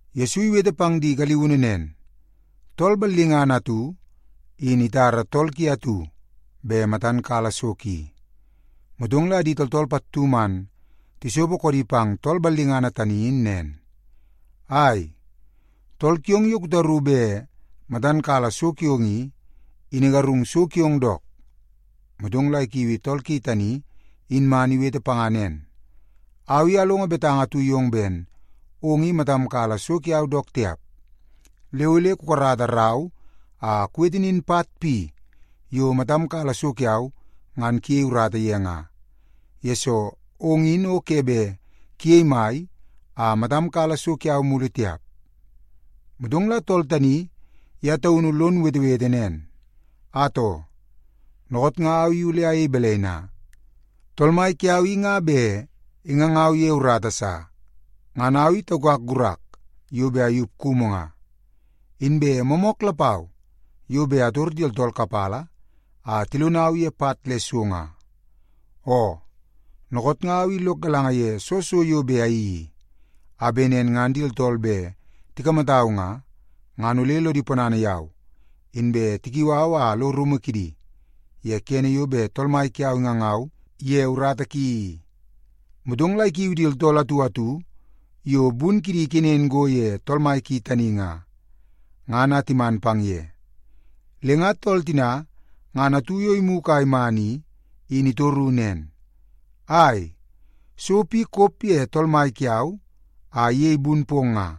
Yesu iwete pang di galiunu nen, “Tool ballingana atu, in itara tool ki atu bet matan kala so ki. Motong la di tooltool pattu man tisopo koodi pang tool ballingana tani in nen, ‘Ai, tool kiong yo kutaru bet matan kala so kiong i, in igarung so kiong dook.’ Motong la ikiui tool ki tani in man iwete panga nen, ‘Au i alongo betanga atu yong ben ong i matam kala so kiau dook tiap. Le ole kukarata rau a kuwete nin pat pi yo matam kala so kiau ngan kuyei urata ye nga, yesoo ong in o ke bet kuyei mai a matam kala so kiau mulu tiap.’ “Motong la tool tani ye taunu lon wetewete nen, ‘Atoo, dookoot nga au i ole ayei balai na? Tool mai kiau i nga bet ingangau ye urata sa. Ngan au i taukak gurak yo bet ayup kumu nga. Inbe moomook lapau yo bet ator di tooltool kapala a tilonau ye pat le so nga. Oo, dookoot nga au i lok galanga ye soo so yo bet ayeii i, a bet nen ngan di tooltool bet tikamatau nga, ngan ole lodi ponana yau inbe tikiu au a alo rumu kidi ye kene yo bet tool mai kiau ingangau ye urata ki i.’ “Motong la ikiu di tooltool atu atu yo bun kidi ikenen go ye tool mai ki tani nga, ngan a timan pang ye. Le nga tool tina ngan atu yo imugu a iman i, in itoru nen, ‘Ai, so pi kop ye tool mai kiau a iyei bun pong nga?’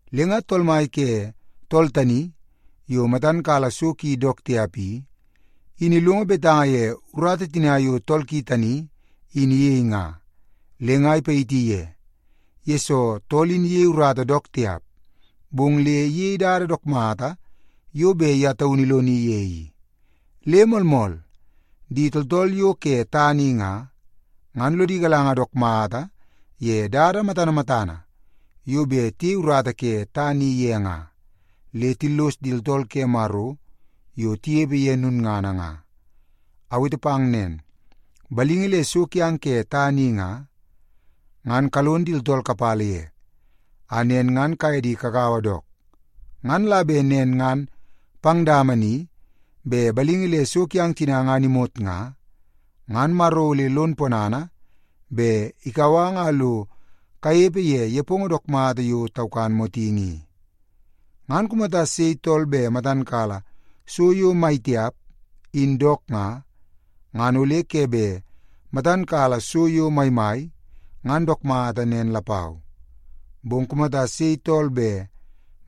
“Le nga tool mai ke tool tani yo matan kala so ki dook tiap i, in ilongo betanga ye urata tina yo tool ki tani in iyei nga, le nga ipayiti ye, yesoo tool in iyei urata dook tiap, bong le iyei dada dook mata yo bet ye taunu iloni ye i. Le moolmool, di tooltool yo ke tana i nga, ngan lodi galanga dook mata ye dada matana matana yo bet tiyei urata ke tana i ye nga, le tillos di tooltool ke Maro yo tinepe ye lulngana nga. Awete pang nen, balingi le so kiang ke tana i nga, ngan kalon di tooltool kapala ye, a nen ngan kaye di kagaua dook. Ngan la bet nen ngan pang dama ni bet balingi le so kiang tina ngan imot nga, ngan Maro ole lon ponana bet ikau ang a lo kanepe ye nepongo dook mata yo taukan motingi i. “Ngan kumata sei tool bet matan kala so yo mai tiap, in dook nga, ngan ole ke bet matan kala so yo maimai, ngan dook mata nen lapau. Bong kumata sei tool bet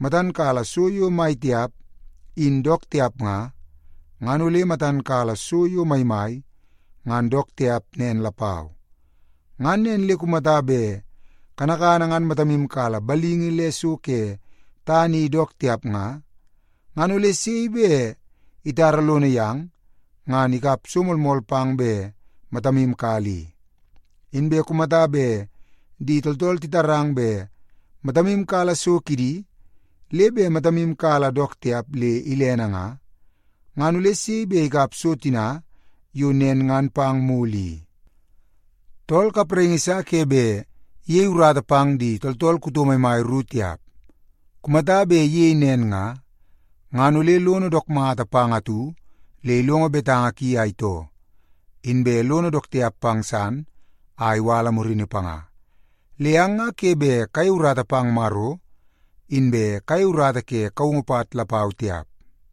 matan kala so yo mai tiap, in dook tiap nga, ngan ole matan kala so yo maimai, ngan dook tiap nen lapau. Ngan nen le kumata bet kanakana ngan matamu kala balingi le so ke tana i dook tiap nga, ngan ole sei bet itara lono yang ngan ikap so moolmool pang bet matamu kala i? Inbe kumata bet di tooltool titarang bet matamu kala so kidi, le bet matamu kala dook tiap le ilene nga, ngan ole sei bet ikap so tina yo nen ngan pang mulu i? “Tool kapraingi sa ke bet iyei urata pang di tooltool kuto maimai ru tiap. Kumata bet iyei nen nga, ngan ole lono dook mata pang atu le ilongo betanga ki a itoo, inbe lono dook tiap pang san a iwala murini panga. Le ang nga ke bet kayei urata pang Maro, inbe kayei urata ke kaungu pat lapau tiap.”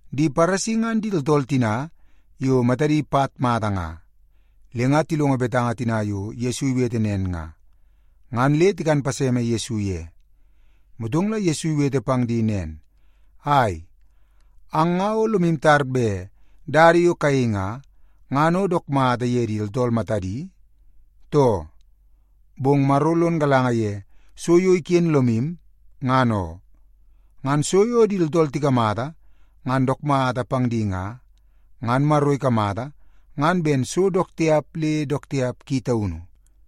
Di Paresi ngan di tooltool tina yo matadi pat mata nga. Le nga tilongo betanga tina yo Yesu iwete nen nga, ngan le tikan paseme Yesu ye. Motong la Yesu iwete pang di nen, “Ai, ang nga o lomu tar bet dada yo kayei nga, ngan o dook mata ye di tooltool matadi, too? Bong Maro lon galanga ye so yo iken lomu, ngan oo. Ngan so yo di tooltool tikamata ngan dook mata pang di nga, ngan Maro ikamata ngan ben so dook tiap le dook tiap ki taunu.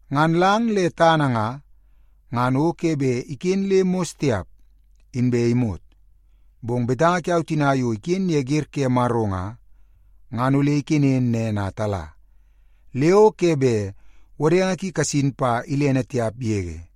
Ngan lang le tana nga, ngan o ke bet iken le mos tiap, inbe imot. Bong betanga tina yo iken ye wer ke Maro nga, ngan ole ikenen nen a tala, le o ke bet wodenge ki kasin pa ilene tiap yege.”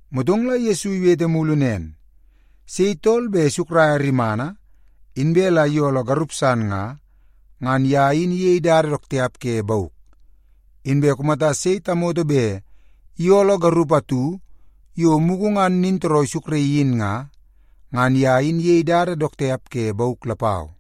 Motong la Yesu iwete mulu nen, “Sei tool bet isukraia rimana, inbe la iyooloo garup san nga, ngan ye in iyei dada dook tiap ke bauk. Inbe kumata sei tamoto bet iyooloo garup atu yo mugu ngan nintooroo isukraii in nga, ngan ye in iyei dada dook tiap ke bauk lapau.”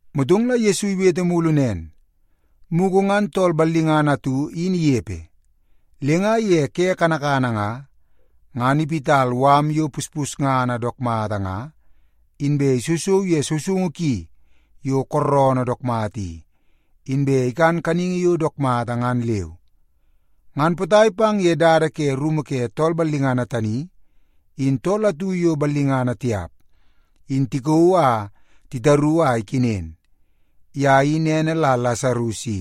Motong la Yesu iwete mulu nen, “Mugu ngan tool ballingana atu in inepe. Le nga ye ke kanakana nga, ngan iwit mala yo puspusngana dook mata nga, inbe isousou ye sousoungu ki yo kooroonoo dook mata i, inbe ikan kaningi yo dook mata ngan leu. Ngan potai pang ye dada ke rumu ke tool ballingana tani, in tool atu yo ballingana tiap in tikauu a titaru a ikenen. Ye in ene la Lasarus i,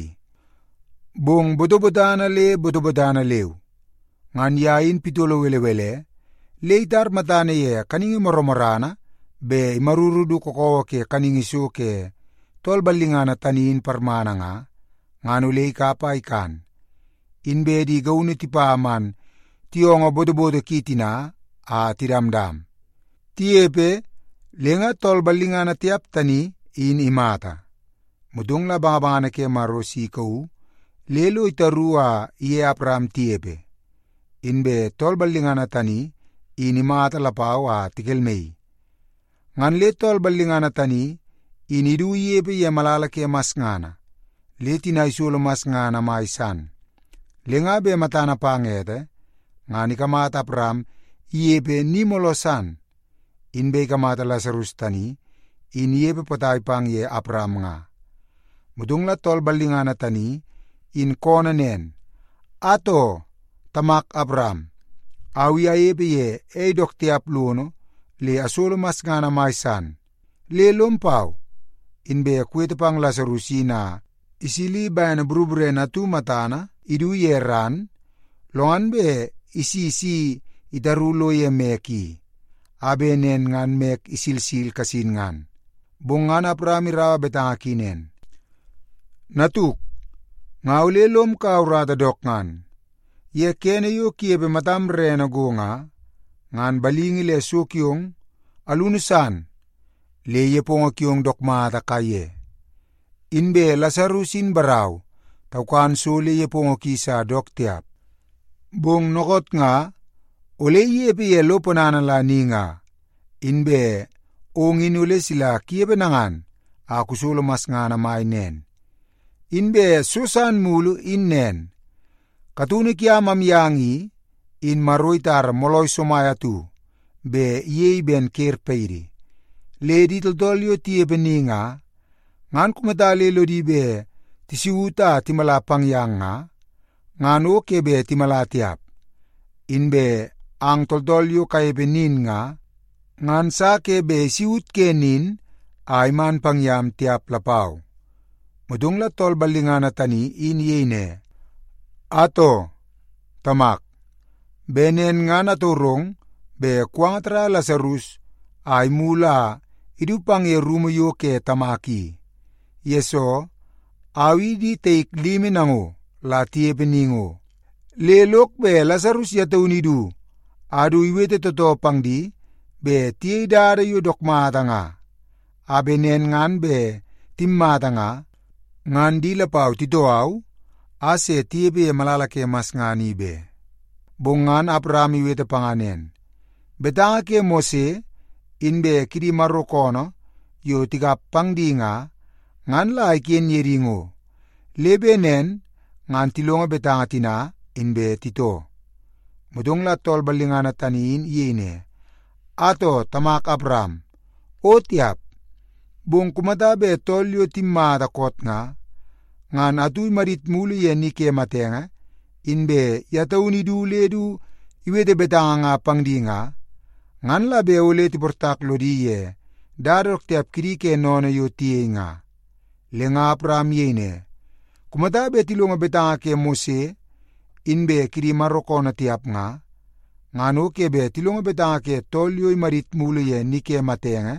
bong botobotana le botobotana leu. Ngan ye in pitolo belebele le itar matana ye kaningi morrana bet imaruru du kakawa ke kaningi so ke tool ballingana tani in parmana nga, ngan ole ikap a ikan. Inbe di gaunu tipa man tiyoongoo botoboto ki tina a tidamdam. “Tinepe, le nga tool ballingana tiap tani, in imata. Motong la bangabangana ke Maro si ikauu le lo titaru a iye Awaram tinepe. Inbe tool ballingana tani, in imata lapau a tikelmaii. Ngan le tool ballingana tani in idu inepe ye malala ke masngana, le tina isolo masngana mai san. Le nga bet matana pang ete, ngan ikamata Awaram inepe ni mooloo san, inbe ikamata Lasarus tani in inepe potai pang ye Awaram nga. Motong la tool ballingana tani in koonoo nen, ‘Atoo, tamak Awaram, au i anepe ye ei dook tiap lono le asolo masngana mai san, le lom pau inbe kuwete pang Lasarus in a isili bene boroborene atu matana idu ye ran, lo ngan bet isi si itaru lo ye mek i, a bet nen ngan mek isilsil kasin ngan.’ “Bong ngan Awaram iraua betanga ki nen, ‘Natuk, nga ole lom kaua urata dook ngan. Ye kene yo kunepe matam rerene go nga, ngan balingi le so kiong alunu san le nepongo kiong dook mata kaiye. Inbe Lasarus in barau taukan so le nepongo ki sa dook tiap. Bong dookoot nga ole inepe ye lo ponana la ni nga, inbe ong in ole sila kunepe nangan a kusolo masngana mai nen. Inbe so san mulu in nen, kataunu kiam amyang i, in Maro itara moolai somai atu bet iyei ben ker paidi. Le di tooltool yo tinepe ni nga, ngan kumata le lodi bet tisaut a timala pang yang nga, ngan o ke bet timala tiap. Inbe ang tooltool yo kanepe nin nga, ngan sa ke bet isaut ke nin a iman pang yam tiap lapau.’ “Motong la tool ballingana tani in iyei ne, ‘Atoo, tamak, bet nen ngan atorong bet kuwanga tarraia Lasarus a imulu a idu pang ye rumu yo ke tamak i, yesoo, au i di taik limi nango la tinepe ni ngo. Le lok bet Lasarus ye taunu idu a du iwete tootoo pang di bet tiyei dada yo dook mata nga, a bet nen ngan bet timmata nga, ngan di lapau titoo au a se tinepe ye malala ke masngana i be.’ “Bong ngan Awaram iwete panga nen, ‘Betanga ke Mose inbe kidi Maro koonoo yo tikap pang di nga, ngan la iken ye di ngo, le bet nen ngan tilongo betanga tina, inbe titoo.’ “Motong la tool ballingana tani in iyei ne, ‘Atoo, tamak Awaram, o tiap! Bong kumata bet tool yo timmata koot nga, ngan atu imadit mulu ye ni ke matenge, inbe ye taunu idu le du iwete betanga nga pang di nga, ngan la bet ole tiportak lodi ye dada dook tiap kidi ke sennene yo tiyei nga.’ “Le nga Awaram iyei ne, ‘Kumata bet tilongo betanga ke Mose inbe kidi Maro koonoo tiap nga, ngan o ke bet tilongo betanga ke tool yo imadit mulu ye ni ke matenge,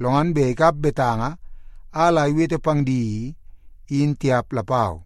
lo ngan bet ikap betanga a la iwete pang di i, in tiap lapau.’”